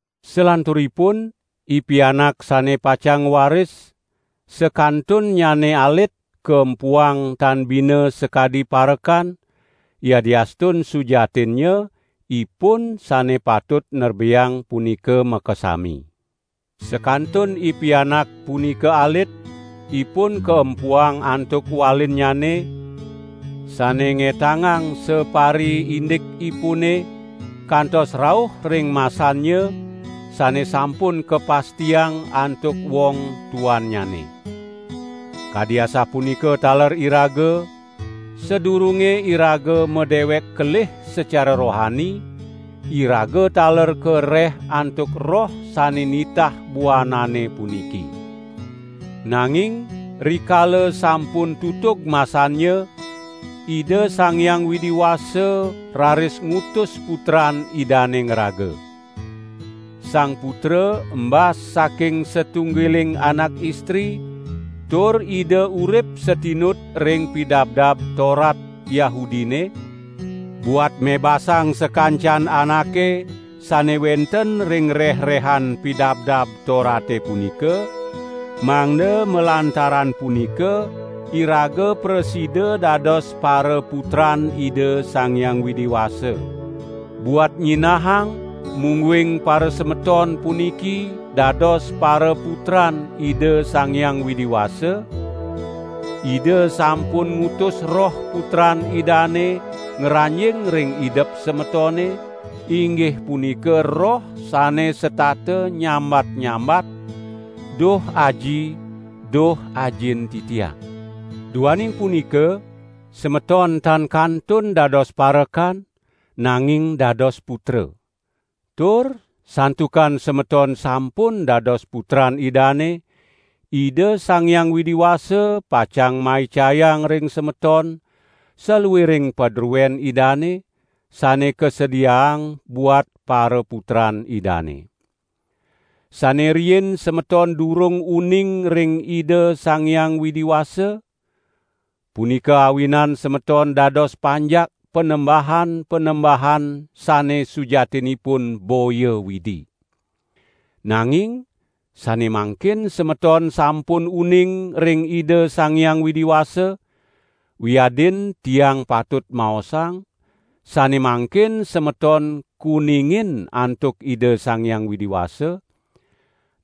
Salanturipun, ipianak sane pacang ngwaris, sakantunnyane alit, kaempuang tan bina sakadi parekan, yadiastun sujatinnya, ipun sane patut nerbeang punika makasami. Sakantun ipianak punika alit, ipun kaempuang antuk walinnyane, sane ngetangang sapariindikipune, kantos rauh ring masannya, sane sampun kapastiang antuk wong tuannyane. Kadi asapunika taler iraga, sadurunge iraga madewek kelih secara rohani, iraga taler kareh antuk roh sane nitah buanane puniki. Nanging rikala sampun tutug masannya, Ida Sang Hyang Widi Wasa raris ngutus Putran Idane ngraga. Sang Putra embas saking satunggiling anak istri, tur Ida urip satinut ring Pidabdab Torat Yahudine; buat mebasang sakancan anake sane wenten ring reh-rehan Pidabdab Torate punika, mangda malantaran punika iraga prasida dados paraputran Ida Sang Hyang Widi Wasa. Buat nyinahang mungguing parasemeton puniki dados paraputran Ida Sang Hyang Widi Wasa, Ida sampun ngutus Roh Putran Idane ngranjing ring idep semetone, inggih punika Roh sane setata nyambat-nyambat: "Duh Aji, duh Ajin titiang." Duaning punika, semeton tan kantun dados parekan nanging dados putra. Tur santukan semeton sampun dados putran Idane, Ida Sang Hyang Widi Wasa pacang maicayang ring semeton saluiring padruen Idane, sane kasediaang buat paraputran Idane. Sane riin semeton durung uning ring Ida Sang Hyang Widi Wasa, punika awinan semeton dados panjak panembahan-panembahan sane sujatinipun boya Widi. Nanging sane mangkin semeton sampun uning ring Ida Sang Hyang Widi Wasa, wiadin tiang patut maosang, sane mangkin semeton kuningin antuk Ida Sang Hyang Widi Wasa,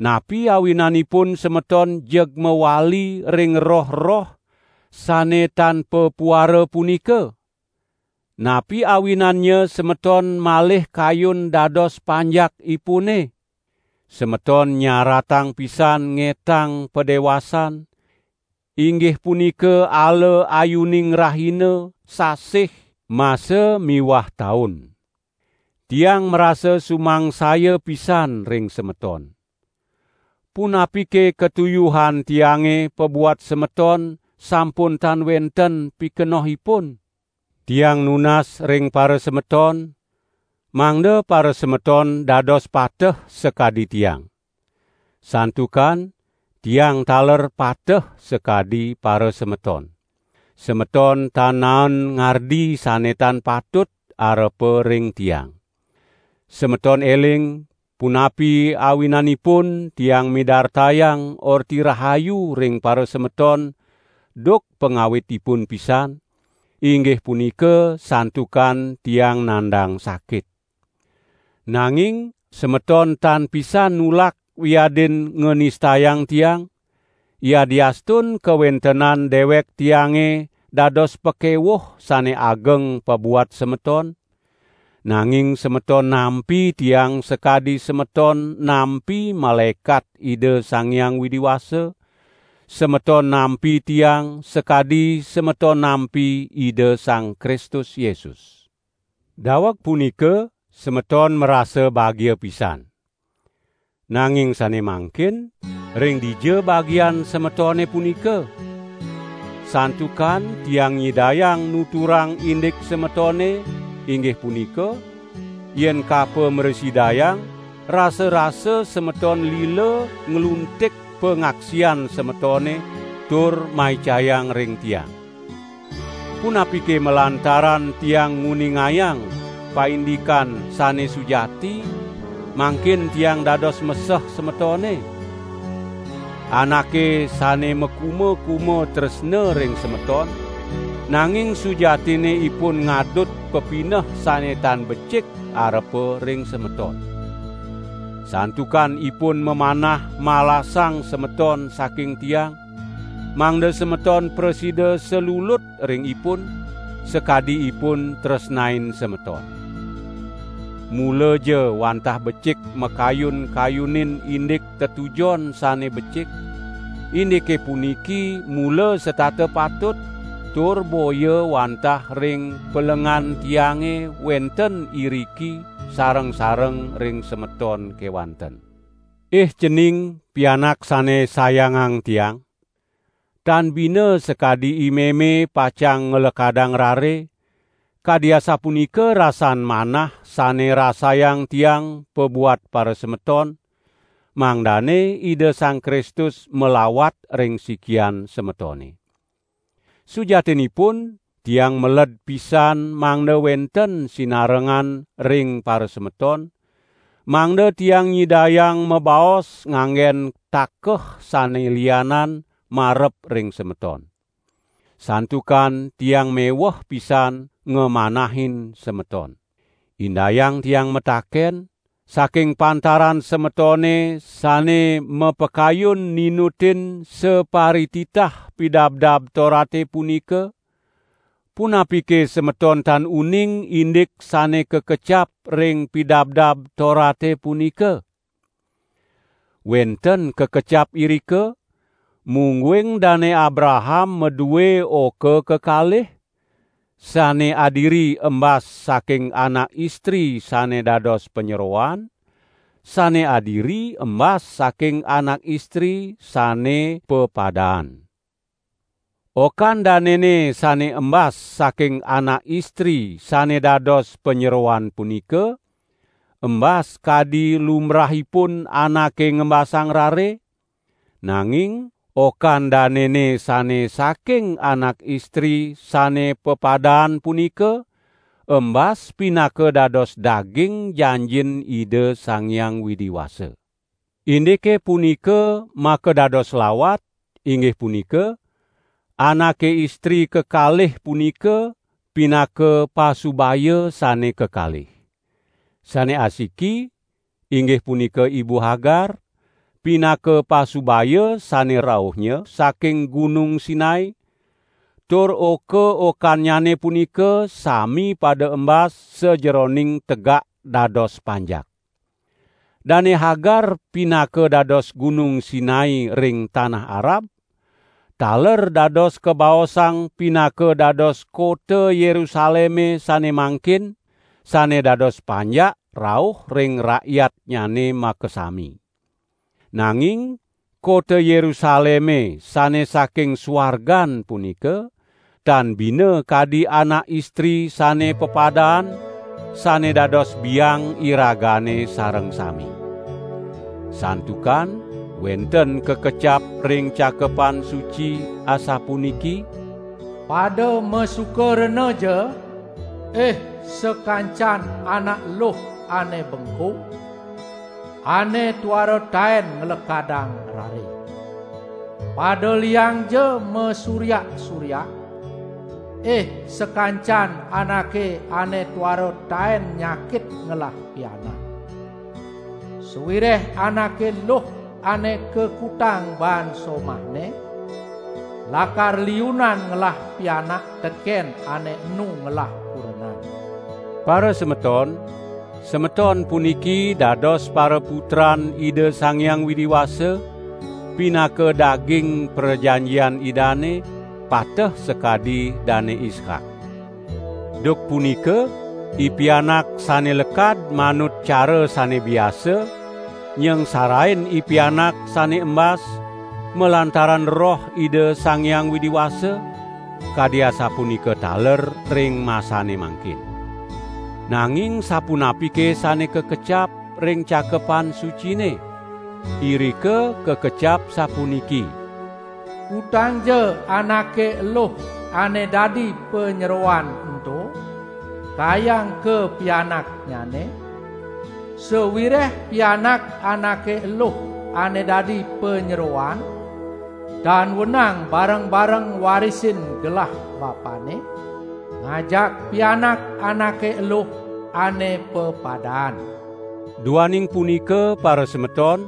napi awinanipun semeton jeg mawali ring roh-roh sane tan papuara punika? Napi awinannya semeton malih kayun dados panjakipune? Semeton nyaratang pisan ngetang padewasan, inggih punika ala ayuning rahina, sasih, masa miwah taun. Tiang marasa sumangsaya pisan ring semeton. Punapike katuyuhan tiange pabuat semeton sampun tan wenten pikenohipun? Tiang nunas ring parasemeton, mangda parasemeton dados pateh sakadi tiang. Santukan, tiang taler pateh sakadi parasemeton. Semeton tan naen ngardi sane tan patut arepa ring tiang. Semeton eling, punapi awinanipun tiang midartayang Orti Rahayu ring parasemeton duk pangawitipun pisan, inggih punika santukan tiang nandang sakit. Nanging semeton tan pisan nulak wiadin nganistayang tiang, yadiastun kawentenan dewek tiange dados pakewuh sane ageng pabuat semeton, nanging semeton nampi tiang sakadi semeton nampi malaekat Ida Sang Hyang Widi Wasa; semeton nampi tiang sakadi semeton nampi Ida Sang Kristus Yesus. Daweg punika semeton marasa bagia pisan. Nanging sane mangkin ring dija bagian semetone punika? Santukan tiang nyidayang nuturang indik semetone, inggih punika: Yen kapo mrasidayang, rasa-rasa semeton lila ngluntik pangaksian semetone tur maicayang ring tiang. Punapike malantaran tiang nguningayang paindikan sane sujati, mangkin tiang dados meseh semetone? Anake sane makuma-kuma tresna ring semeton, nanging sujatinne ipun ngadut pepineh sane tan becik arepa ring semeton. Santukan ipun mamanah malasang semeton saking tiang, mangda semeton prasida salulut ring ipun, sakadi ipun tresnain semeton. Mulaja wantah becik makayun-kayunin indik tetujon sane becik, indike puniki mula setata patut, tur boya wantah ring pelengan tiange wenten iriki sareng-sareng ring semeton kewanten. Ih cening, pianak sane sayangang tiang! Tan bina sakadi imeme pacang nglekadang rare, kadi asapunika rasan manah sane rasayang tiang pabuat parasemeton, mangdane Ida Sang Kristus malawat ring sikian semetone. Sujatinipun tiang meled pisan mangda wenten sinarengan ring parasemeton, mangda tiang nyidayang mabaos nganggen takeh sane lianan, marep ring semeton. Santukan tiang meweh pisan ngamanahin semeton. Indayang tiang mataken, saking pantaran semetone sane mapakayun ninutin saparititah Pidabdab Torate punika, punapike semeton tan uning indik sane kakecap ring Pidabdab Torate punika? Wenten kakecap irika, mungguing Dane Abraham madue oka kekalih, sane adiri embas saking anak istri sane dados panyeroan, sane adiri embas saking anak istri sane pepadaan. Okan danene sane embas saking anak istri sane dados panyeroan punika, embas kadi lumbrahipun anake ngembasang rare, nanging okan danene sane saking anak istri sane pepadaan punika, embas pinaka dados daging janjin Ida Sang Hyang Widi Wasa. Indike punika makadados lawat, inggih punika: Anake istri kekalih punika pinaka pasubaya sane kekalih. Sane asiki (inggih punika ibu Hagar) pinaka pasubaya sane rauhnya saking Gunung Sinai, tur oka-okannyane punika sami pada embas sajeroning tegak dados panjak. Dane Hagar pinaka dados Gunung Sinai ring tanah Arab, taler dados kabaosang pinaka dados kota Yerusaleme sane mangkin, sane dados panjak rauh ring rakyatnyane makasami. Nanging kota Yerusaleme sane saking suargan punika, tan bina kadi anak istri sane pepadaan, sane dados biang iragane sareng sami. Santukan wenten kakecap ring Cakepan Suci asapuniki: "Pada masuka renaja, ih sakancan anak luh ane bekung, ane tuara taen nglekadang rare. Pada liangja masuryak-suryak, ih sakancan anake ane tuara taen nyakit ngelah pianak. Sawireh anake luh ane kakutang baan somahne, lakar liunan ngelah pianak teken ane enu ngelah kurenan." Parasemeton, semeton puniki dados paraputran Ida Sang Hyang Widi Wasa, pinaka daging prajanjian Idane, pateh sakadi Dane Ishak. Duk punika ipianak sane lekad manut cara sane biasa, nyangsarain ipianak sane embas malantaran Roh Ida Sang Hyang Widi Wasa; kadi asapunika taler ring masane mangkin. Nanging sapunapike sane kakecap, ring Cakepan Sucine? Irika kakecap sapuniki: "Kutangja anake eluh ane dadi panyeroan ento kayang kapianaknyane; sawireh pianak anake eluh ane dadi panyeroan tan wenang bareng-bareng ngwarisin gelah bapanne, ngajak pianak anake eluh ane pepadaan." Duaning punika parasemeton,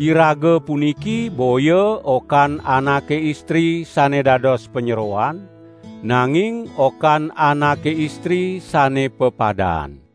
iraga puniki boya okan anake istri sane dados panyeroan, nanging okan anake istri sane pepadaan.